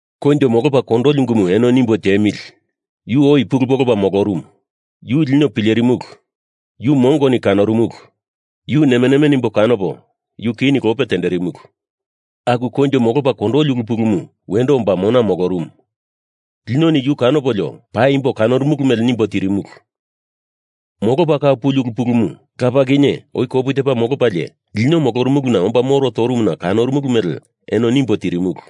Koinjo molopa kondoli ungumu eno nimbo tiemili! Yu oi pulu polopa molorumu. Yu lino pilerimulu. Yu mongoni kanorumulu. Yu nemeneme nimbo kanopo yu kini lope tenderimulu. Aku koinjo molopa kondoli ulu pulumu wendo omba mona molorumu. Linoni yu kanopolio paimbo kanorumulu mele nimbo tirimulu. Molopa kau puli ulu pulumu Lapa kinye oi kopu tepa molopalie lino molorumuluna omba moro torumuna kanorumulu mele eno nimbo tirimulu.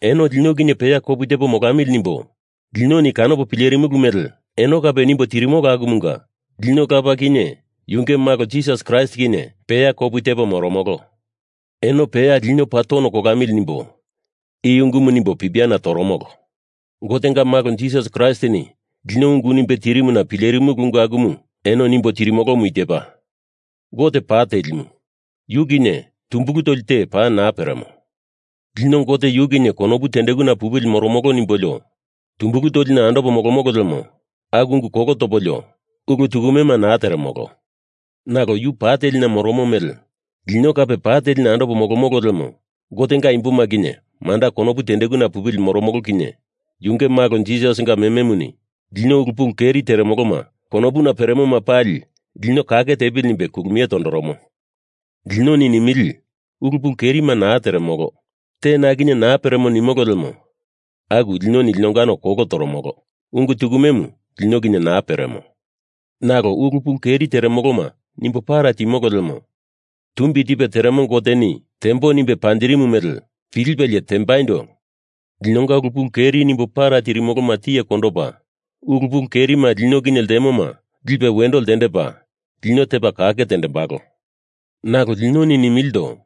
Eno lino kinye peya kopu tepo molamili nimbo linoni kanopo pilerimulu mele eno kape nimbo tirimolo akumunga lino Lapa kinye yunge Malo Jisas Kraist kinye peya kopu tepo moromolo. Eno peya lino paa tono kolamili nimbo i ungumu nimbo pipiana toromolo. Gotenga Malo Jisas Kraistini lino ungu nimbe tirimuna pilerimumulu ungu akumu eno nimbo tirimolomu i tepa: Gote pa telimu. Yu kinye tumbulu toli te paa naa peremo. Lino Gote yu kinye konopu tendekuna pupili moromolo nimbolio tumbulu tolina andopo molomolo lemo aku ungu kolo topolio, ulu tukumema naa teremolo. Nalo yu pa telina moromo mele lino kape pa telina andopo molomolo lemo Gotenga imboma kinye manda konopu tendekuna pupili moromolo kinye yunge Malo Jisasinga mememuni lino ulu pulu keri teremolo konopuna peremoma pali lino kake tepili nimbe kulumie tondoromo. Linoni nimili ulu pulu kerima naa teremolo, te na kinye naa peremo nimolo lemo aku lino linongano kolo toromolo, ungu tukumemu lino kinye naa peremo. Nalo ulu pulu keri teremoloma nimbo para timolo lemo Tumbi Tipe Teremo Goteni tembo nimbe panjirimu mele pilipelie tembaindo linonga ulu pulu keri nimbo para tirimoloma tiye kondopa ulu pulu kerima lino kinye ltemoma lipe wendo ltendepa lino tepa kake tendembalo. Nalo linoni nimilindo: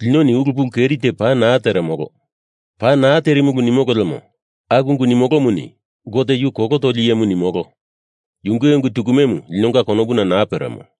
Linoni ulu pulu keri te paa naa teremolo, paa naa terimulu nimolo lemo aku ungu nimolomuni Gote yu kolo toli iyemu nimolo, yunge ungu tukumemu linonga konopuna naa peremo.